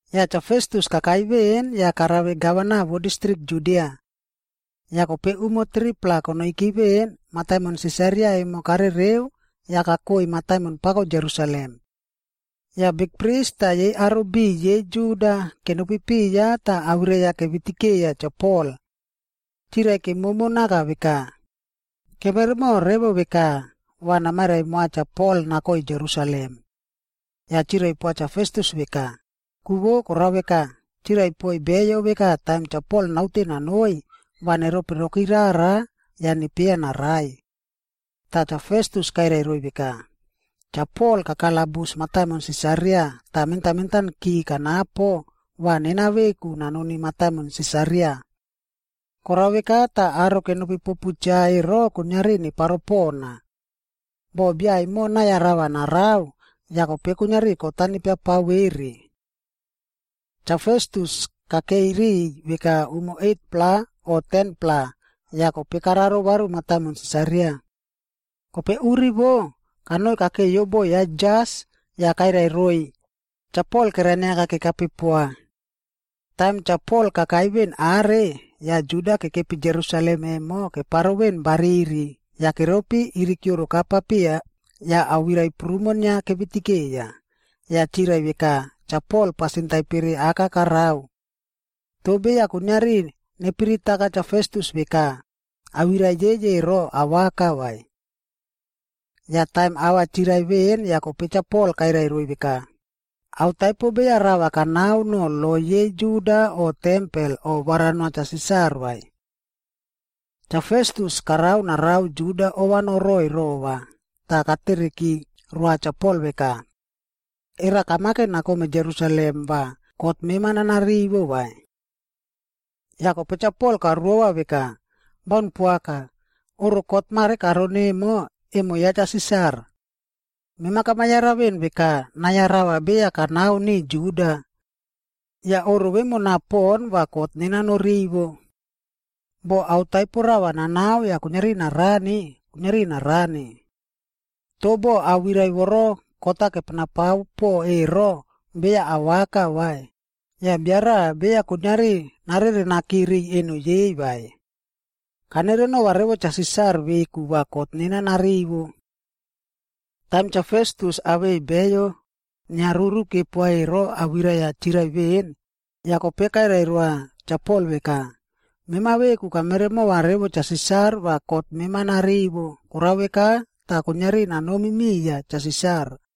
Yah Cha Festus kakai veꞌen yah karave gavana vo distrik Judia. Yah kope umo 3-pla konoiki veꞌen, mataimon Sisaria emo karereu yah kakoi mataimon pako Jerusalem. Yah bikpris tah yei aro biꞌiy yei Juda kenopi piya tah awirai-a kevitikeiya Cha Pol. Chirai kemomo naka veka, “Kemeremo revo veka va namairai moa Cha Pol nakoi Jerusalem.” Yah chirai poa Cha Festus veka, ku vo korao veka, chirai poiy beyo veka taim Cha Pol naute nanoi, va neropiroki rara yah nepieya narai. Tah Cha Festus kairai roiy veka, “Cha Pol kakalabus mataimon Sisaria tah mentan mentanki kanapo va nena veku nanoni mataimon Sisaria. Korao veka tah aro kenopi popu cha ero kuiniari neparo pona. Boh bia emo nai-a rava narao, yah kope kuiniari kot-a nepiapao vere.” Cha Festus kakeiy riꞌiy veka umo 8-pla o 10-pla yah kope kararo varu mataimon Sisaria. Kope uri vo, kanoi kakeiyo bo ya jas yah kairai roiy Cha Pol kerainiaka kekape poa. Taim Cha Pol kakai veꞌen are, yah Juda kekepi Jerusalem emo keparo veꞌen bariri yah keropi irikioroka papiya yah awirai prumo inia kevitikeiya, yah chirai veka Cha Pol pasin taipere aka karao. Toh beya kuiniari nepiritaka Cha Festus veka, awirai yei ero awaka vai. Yah taim ava chirai veꞌen yah kope Cha Pol kairai roiy veka, “Ao taipo beya rava kanao no lo yei Juda o tempel o varanoa Cha Sisar vai.” Cha Festus karao narao Juda ova noroiy rova tah katereki roa Cha Pol veka “Era kamake nakome Jerusalem va kot mema nanarivo vai?” Yah kope Cha Pol karuova veka, “Baun poaka! Oꞌro kot mare karon emo, emo ya Cha Sisar. Mema kamayara veꞌen veka nai-a rava beya kanao niꞌiy Juda. Yah oꞌro vemona pon va kot nena norivo. Boh ao taipo rava nanao yah kuiniari narani, kuiniari narani. Toh boh awirai voro kot-a kepenapao po ero beya awaka vai, yah bia raꞌa beya kuiniari narerenaki riꞌiy eno yei vai. Kanerenova revo Cha Sisar veku va kot nena narivo.” Taim Cha Festus awei beyo inia ruru kepoa ero awirai-a chirai veꞌen, yah kope kairai roa Cha Pol veka, “Mema veku kameremova revo Cha Sisar va kot mema narivo, korao veka tah kuiniari nanomi miya Cha Sisar.”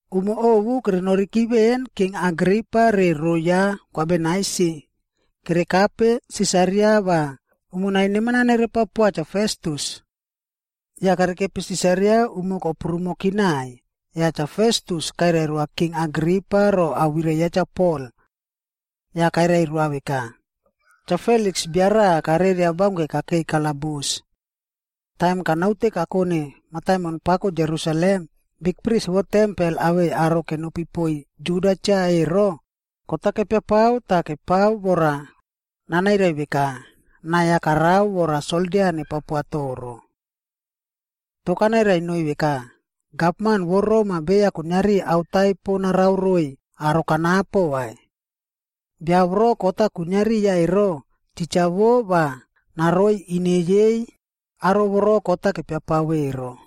Umo ovu kerenoriki veꞌen, King Agripaa re rou ya Kwa Bernaisi kerekape Sisaria va umonai neman-a nerepao poa Cha Festus. Yah kerekepi Sisaria umo koprumoki naiy, yah Cha Festus kairai roa King Agripa ro awirai yah Cha Pol. Yah kairai roa veka, “Cha Feliks bia raꞌa kareria baunke kakeiy kalabus. Taim kanaute kakone mataimon pako Jerusalem, bikpris vo tempel awei aro kenopi poiy Juda cha ero, kot-a kepiapao tah kepao vora nanairai veka, nai-a karao vora soldia nepao poa toro. “Toh kanairai noiy veka, ‘Gavman vo Rom-a beya kuiniari ao taipo narao roiy aro kanapo vai. Bia voro kot-a kwinia riya ero, titja wo va naroi ine yei aro voro kot-a kepiapao ero.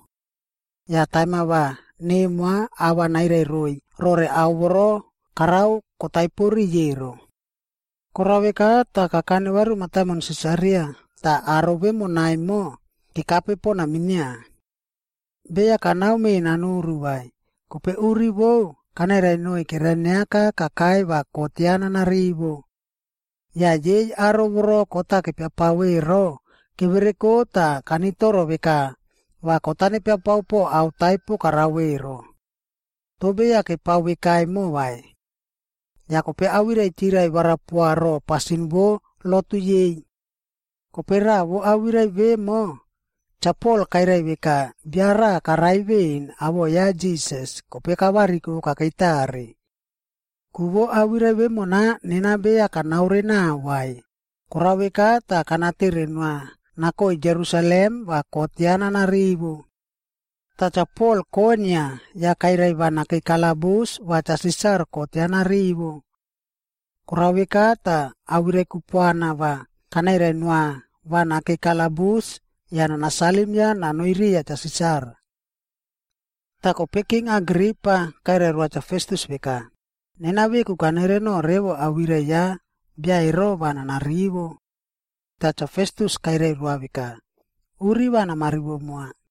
Yah taim-a va nemoa ava nairai roiy rore ao voro karao kotaipo riꞌiy ero.’ Korao veka tah kakane varu mataimon Sisaria tah aro vemona emo kekape pona minia. Beya kanao menanuru vai, kope uri vou kanairai noiy kerainiaka kakai va kot ya nanarivo. Yah yei aro voro kot-a kepiapao ero kevereko tah kanitoro veka va kot-a nepiapao po ao taipo karao ero. Toh beya kepao veka emo vai. Yah kope awirai chirai varapoa ro pasin vo lotu yei. Kope raꞌa vo awirai vemo, Cha Pol kairai veka bia raꞌa karai veꞌen awoꞌo ya Jisas, kope kavariko kakei tare. Ku vo awirai vemona nena beya kanaore nao vai, korao veka tah kanatere noa nakoi Jerusalem va kot ya nana rivo. Tah Cha Pol koinia yah kairai va nakei kalabus va Cha Sisar kot ya narivo. Korao veka tah, awirai kupuana va kanairai noa va nakei kalabus yah nanasalim ya nanoiy riya Cha Sisar.” Tah kope King Agripa kairai roa Cha Festus veka, “Nena veku kanereno revo awirai ya bia ero va nanarivo.” Tah Cha Festus kairai roa veka, “Uri va namarivo moa.”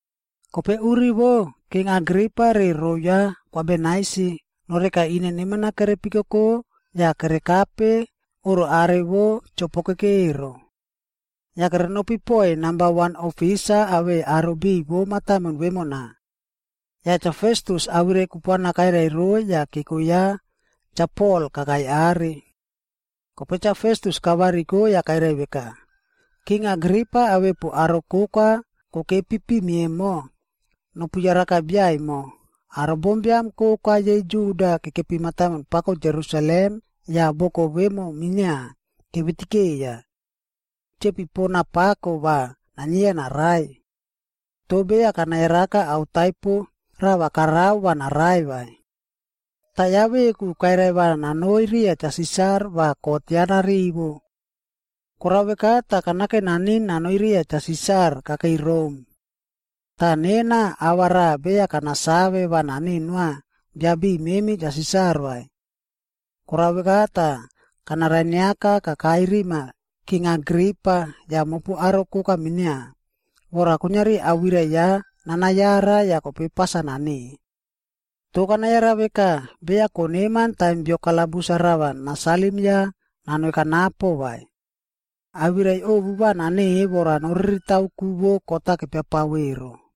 Kope uri vo, King Agripa re rou ya Kwa Bernaisi noreka ine neman-a kerepikoko yah kerekape oꞌro are vo chopokeke ero. Yah kerenopi poiy namba wan ofisa awei aro biꞌiy vo mataimon vemona. Yah Cha Festus awirai kupuana kairai roiy yah keko ya Cha Pol kakai are. Kope Cha Festus kavariko yah kairai veka, “King Agripa awepu aro koka kokepi pimi emo, nopu yaraka bia emo, aro bombiam koka yei Juda kekepi mataimon pako Jerusalem yah boko vemo minia, kevitikeiya. Chepi pona pako va nainieya narai. Toh beya kanayaraka ao taipo rava karao va narai vai. Tah ya veku kairai va nanoi riya Cha Sisar va kot ya narivo. Korao veka tah kanake naniꞌin nanoi riya Cha Sisar kakei Rom. Tah nena, ava raꞌa beya kanasave va naneꞌe noa bia biꞌiy memi Cha Sisar vai. Korao veka tah, kanarainiaka kakai rima King Agripa yah mopu aro koka minia, vora kuiniari awirai ya nanayara yah kope pas-a naneꞌe. Toh kanayara veka beya koneman taim bio kalabus-a rava nanasalim ya nanoi kanapo vai. Awirai ovu va naneꞌe vora noriritao ku vo kot-a kepiapao ero.”